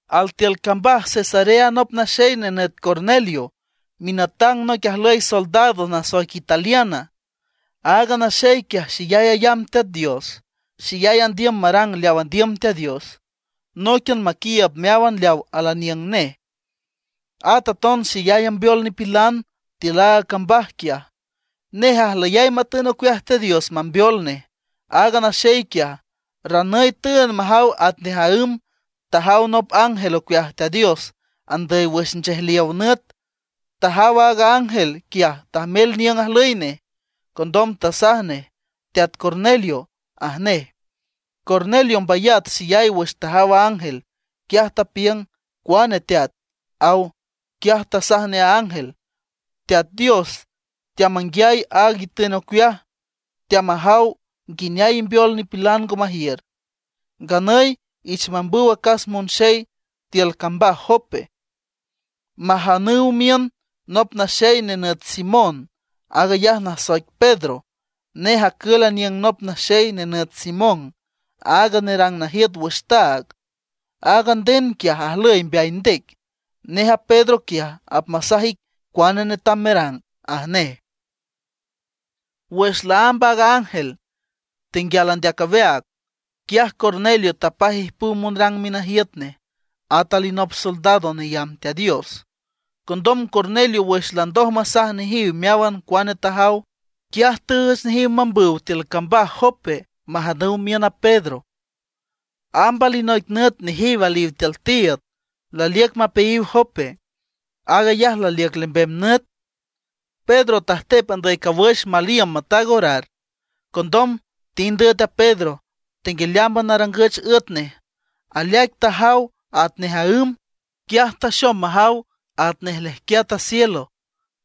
Altiül cambaj Cesarea nop naxey nenüt Cornelio, minatang noic ajlüy soldados nasoic Italiana. Aaga naxey quiaj, xeyay ayamb Teat Dios, xeyay andiüm marang leaw andiüm Teat Dios, nóiquian maquiiüb meáwan leaw al aniüng nej. At aton xeyay ambeol nipilan tiül aaga cambaj quiaj. Nej ajlüyay matün ocueaj Teat Dios mambeol nej. Aaga naxey quiaj, ranüy tüünd majaw atnej aǘm, tajaw nop ángel ocueaj Teat Dios andüy wüx nchejliow nüt. Tajaw aaga ángel quiaj tajmel niüng ajlüy nej. Condom tasaj nej: ―¡Teat Cornelio! ―aj nej. Cornelio mbayat xeyay wüx tajaw a ángel. Quiaj tapiüng: ―¿Cuane Teat? ―aw. Quiaj tasaj nej a ángel: ―Teat Dios teamanguiay aag itün ocueaj, teamajaw nguineay imbeol nipilan ngo majiür. Nganüy iich mambüw acas monxey tiül cambaj Jope, majanüw miün nop naxey nenüt Simón, aag ayaj nasoic Pedro. Nej acül aniüng nop naxey nenüt Simón, aaga nerang najiüt wüx taag. Aaga nden quiaj ajlüy mbeay ndec. Nej a Pedro quiaj, apmasaj ic cuane netam merang ―aj nej. Wüx laámb aaga ángel tenguial andeac aweaag, quiaj Cornelio tapaj ijpüw monrang minajiüt nej, at alinop soldado neyamb Teat Dios. Condom Cornelio wüx landoj masaj nejiw meáwan cuane tajaw, quiaj tüüch nejiw mambüw tiül cambaj Jope majanüw miün a Pedro. Amb alinoic nüt nejiw aliw tiül tiiüd, laliüc mapeayiw Jope. Aag ayaj laliüc lembem nüt. Pedro tajtep andüy cawüx mal iüm mataag orar. Condom tind üet a Pedro. Tenguialeámban arangüch üet nej, aleaic tajaw atnej aǘm. Quiaj taxom majaw atnej lejquiat a cielo.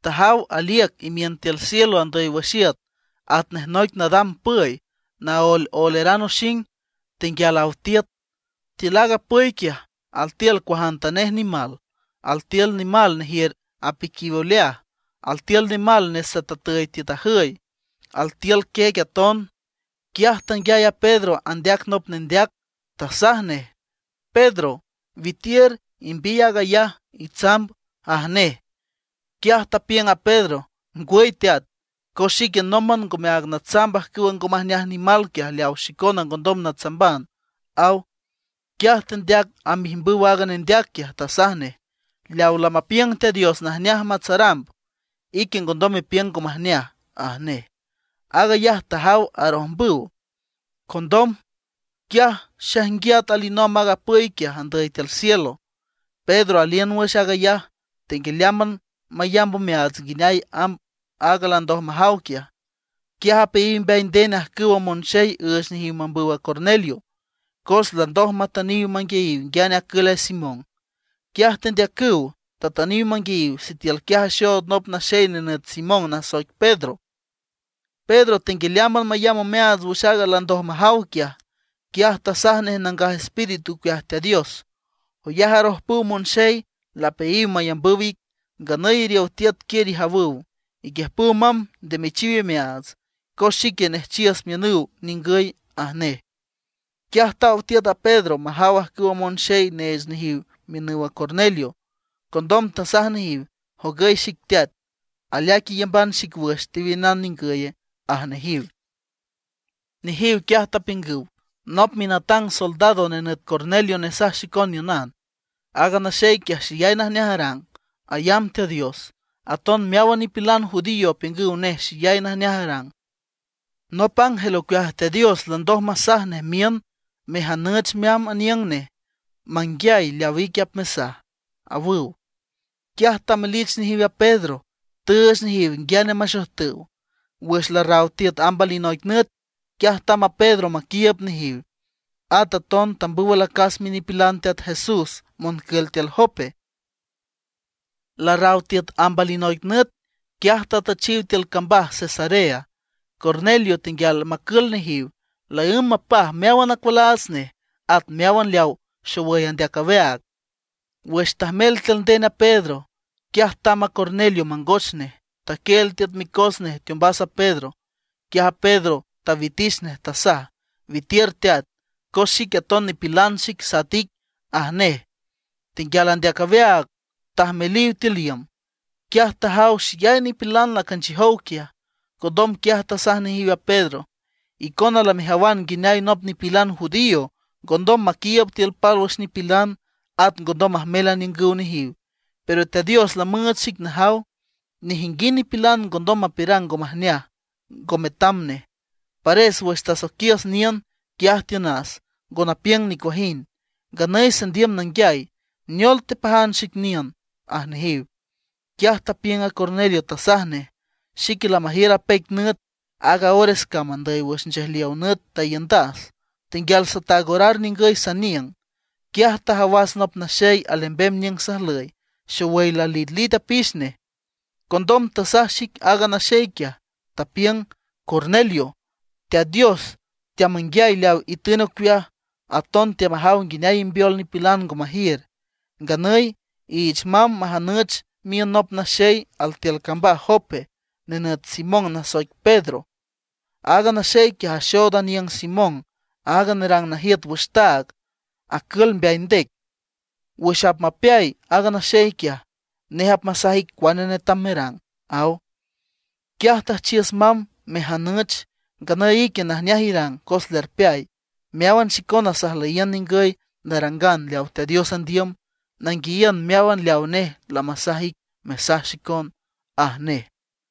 Tajaw aliüc imiün tiül cielo andüy wüx iüt atnej noic nadam püy, naoeloeleran oxing, tenguial aw tiüt. Tiül aaga püy quiaj, altiül cuajantanej nimal. Altiül nimal nejiür apiquiw oleaj; altiül nimal nesatatüy tiüt ajüy; altiül quiec aton. Quiaj tanguiay a Pedro andeac nop nendeac, tasaj nej: ―Pedro, witiür imbiy aag ayaj, itsamb ―aj nej. Quiaj tapiüng a Pedro: ―Ngwüy Teat, cos xique nómban ngome aag natsamb ajcüwa ngo majneaj nimal quiaj leaw xicona ngondom natsamban ―aw. Quiaj tendeac amb ijmbüw aaga nendeac quiaj, tasaj nej: ―Leaw lamapiüng Teat Dios najneaj matsaramb, ique ngondom mepiüng ngo majneaj ―aj nej. Aag ayaj tajaw arojmbüw. Condom, quiaj xaijnguiat alinomb aaga püy quiaj, andüy tiül cielo. Pedro aliün wüx aag ayaj, tenguialeámban mayamb omeaats nguineay amb aaga landoj majaw quiaj. Quiaj apeayiw mbeay nden ajcüwa monxey üüch nejiw mambüw a Cornelio, cos landoj matüniw manguiayiw nguiane acül a Simón. Quiaj tendeacüw, tatüniw manguiayiw, sitiül quiaj axood nop naxey nenüt Simón nasoic Pedro. Pedro tenguialeámban mayamb omeaats wüx aaga landoj majaw quiaj, quiaj tasaj nej Nangaj Espíritu ocueaj Teat Dios: ―Joyaj arojpüw monxey lapeayiw mayambüw ic. Nganüy iriow tiüt quiür ijawüw, iquiüjpüw mamb nde mechiw imeaats. Cos xique nejchiüs miünüw ningüy ―aj nej. Quiaj taw tiüt a Pedro majaw ajcüwa monxey neech nejiw miünüw a Cornelio. Condom tasaj nejiw: ―Jogüy xic, teat. ¿Aleaic iyamban xic wüx tewiünan ningüye? ―aj nejiw. Nejiw quiaj tapiüngüw: ―Nop minatang soldado nenüt Cornelio nesaj xicon niünan. Aaga naxey quiaj xeyay najneaj arang, ayamb Teat Dios. Aton meáwan nipilan judío apiüngüw nej xeyay najneaj arang. Nop ángel ocueaj Teat Dios landoj masaj nej miün mejanüch meamb aniüng nej manguiay leaw ique apmesaj ―awüw. Quiaj tamelich nejiw a Pedro, tüüch nejiw nguiane maxojtüw. Wüx larraw tiüt amb alinoic nüt, quiaj tamb a Pedro maquiiüb nejiw. At aton tambüw alacas minipilan Teat Jesús moncül tiül Jope. Larraw tiüt amb alinoic nüt, quiaj tatüchiw tiül cambaj Cesarea. Cornelio tenguial macül nejiw; laǘmb mapaj meáwan acualaats nej, at meáwan leaw xowüy andeac aweaag. Wüx tajmel tiül nden a Pedro, quiaj tamb a Cornelio mangoch nej, taquieel tiüt micos nej teombas a Pedro. Quiaj a Pedro tawitich nej, tasaj: ―Witiür teat, cos xique aton nipilan xic sat ic ―aj nej. Tenguial andeac aweaag tajmeliw tiül iüm. Quiaj tajaw xeyay nipilan lacanchiüjow quiaj. Condom quiaj tasaj nejiw a Pedro: ―Icona lamejawan nguineay nop nipilan judío ngondom maquiiüb tiül pálwüx nipilan; at ngondom majmel aniüngüw nejiw. Pero Teat Dios lamüüch xic najaw, nejinguind nipilan ngondom mapiürang ngo majneaj, ngo metam nej. Pares wüx tasoiquiüs niün, quiaj tiünas, ngo napiüng nicuajind. Nganüy sandiüm nanguiay ¿neol tepajan xic niün? ―aj nejiw. Quiaj tapiüng a Cornelio, tasaj nej: ―Xique lamajiür apeic nüt, aaga ores cam andüy wüx nchejliow nüt taiündas, tenguial sataag orar ningüy saniüng. Quiaj tajawas nop naxey alembem niüng sajlüy, xowüy lalitlit apix nej. Condom tasaj xic aaga naxey quiaj, tapiüng: “Cornelio, Teat Dios teamanguiay leaw itün ocueaj, aton teamajaw nguineay imbeol nipilan ngo majiür. Nganüy iich mamb majanüch miün nop naxey altiül cambaj Jope, nenüt Simón nasoic Pedro. Aaga naxey quiaj axood aniüng Simón aaga nerang najiüt wüx taag, acül mbeay ndec. Wüx apmapeay aaga naxey quiaj, nej apmasaj ic cuane netam merang”, aw. Quiaj tüjchiüs mamb mejanüch. Nganüy ique najneaj irang cos lerpeay. Meáwan xicona sajlüyiün ningüy narangan leaw Teat Dios andiüm, nanguiayiün meáwan leaw nej lamasaj ic mesaj xicon ―aj nej.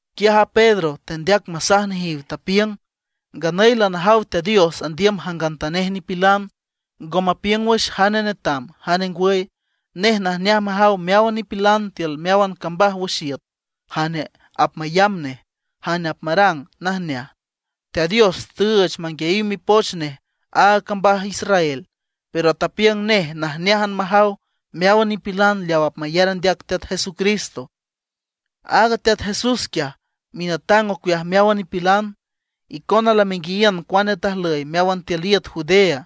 Quiaj a Pedro tendeac masaj nejiw, tapiüng: ―Nganüy lanajaw Teat Dios andiüm jangantanej nipilan, ngo mapiüng wüx jane netam, jane ngwüy. Nej najneaj majaw meáwan nipilan tiül meáwan cambaj wüx iüt jane apmayamb nej, jane apmarang najneaj. Teat Dios tüüch manguiayiw mipoch nej aaga cambaj Israel, pero tapiüng nej najneájan majaw meáwan nipilan leaw apmayar andeac Teat Jesucristo. Aaga Teat Jesús quiaj, minatang ocueaj meáwan nipilan. Icona lamenguiayiün cuane tajlüy meáwan tiül iüt Judea.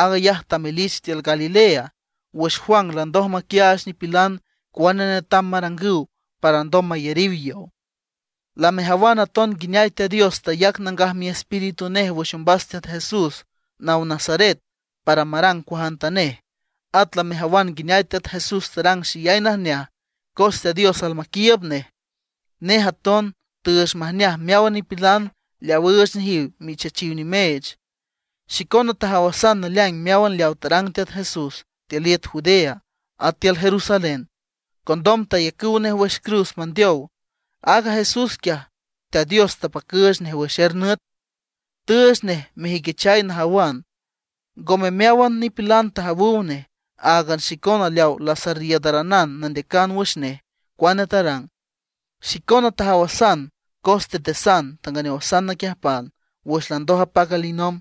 Aag ayaj tamelich tiül Galilea, wüx Juan landoj maquiaach nipilan cuane netam marangüw para alndom mayariw yow. Lamejawan aton nguineay Teat Dios tayac Nangaj Miespíritu nej wüx ombas Teat Jesús naw Nazaret para marang cuajantanej. At lamejawan nguineay Teat Jesús tarang xeyay najneaj cos Teat Dios almaquiiüb nej. Nej aton tüüch majneaj meáwan nipilan leaw üüch nejiw michachiw nimeech. Xicona tajawasan naleaing meáwan leaw tarang Teat Jesús tiül iüt Judea, at tiül Jerusalén. Condom tayacüw nej wüx cruz mandeow. Aaga Jesús quiaj Teat Dios tapacüüch nej wüx er nüt; tüüch nej mejüiquichay najawan. Ngome meáwan nipilan tajawüw nej, áagan xicona leaw lasarriiüdaranan nandeacan wüx nej cuane tarang. Xicona tajawasan, cos tetesan, tanganeowasan naquiüjpan wüx landoj apac alinomb.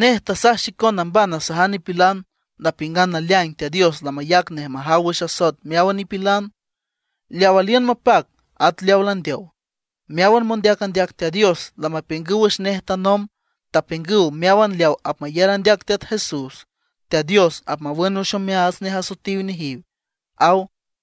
Nej tasaj xicon namban nasajan nipilan, napiüngan naleaing Teat Dios lamayac nej majaw wüx asoet meáwan nipilan, leaw aliün mapac at leaw landeow. Meáwan mondeac andeac Teat Dios lamapiüngüw wüx nej tanomb. Tapiüngüw meáwan leaw apmayar andeac Teat Jesús, Teat Dios apmawün wüx omeaats nej asoetiw nejiw ―aw.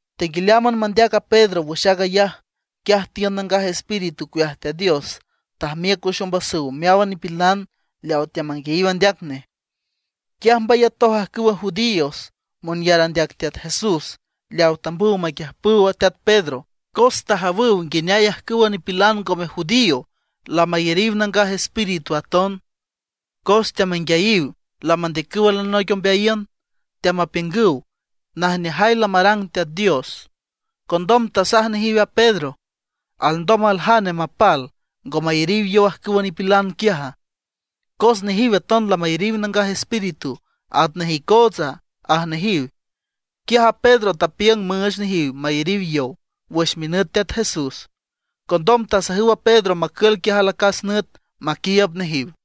Tenguialeámban mandeac a Pedro wüx aag ayaj, quiaj tiün Nangaj Espíritu ocueaj Teat Dios, tajmiüc wüx ombasüw meáwan nipilan leaw teamanguiayiw andeac nej. Quiaj mbayatoj ajcüwa judíos monyar andeac Teat Jesús leaw tambüw maquiüjpüw teat Pedro, cos tajawüw nguineay ajcüwa nipilan ngome judío lamayariw Nangaj Espíritu aton. Cos teamanguiayiw lamandeacüw alinoic ombeayiün, teamapiüngüw najneajay lamarang Teat Dios. Condom tasaj nejiw a Pedro: ―¿Alndom aljane mapal, ngo mayariw yow ajcüwa nipilan quiaja? Cos nejiw aton lamayariw Nangaj Espíritu atnej icootsa ―aj nejiw. Quiaj a Pedro tapiüng müüch nejiw mayariw yow wüx minüt Teat Jesús. Condom tasajüw a Pedro macül quiaj alacas nüt maquiiüb nejiw.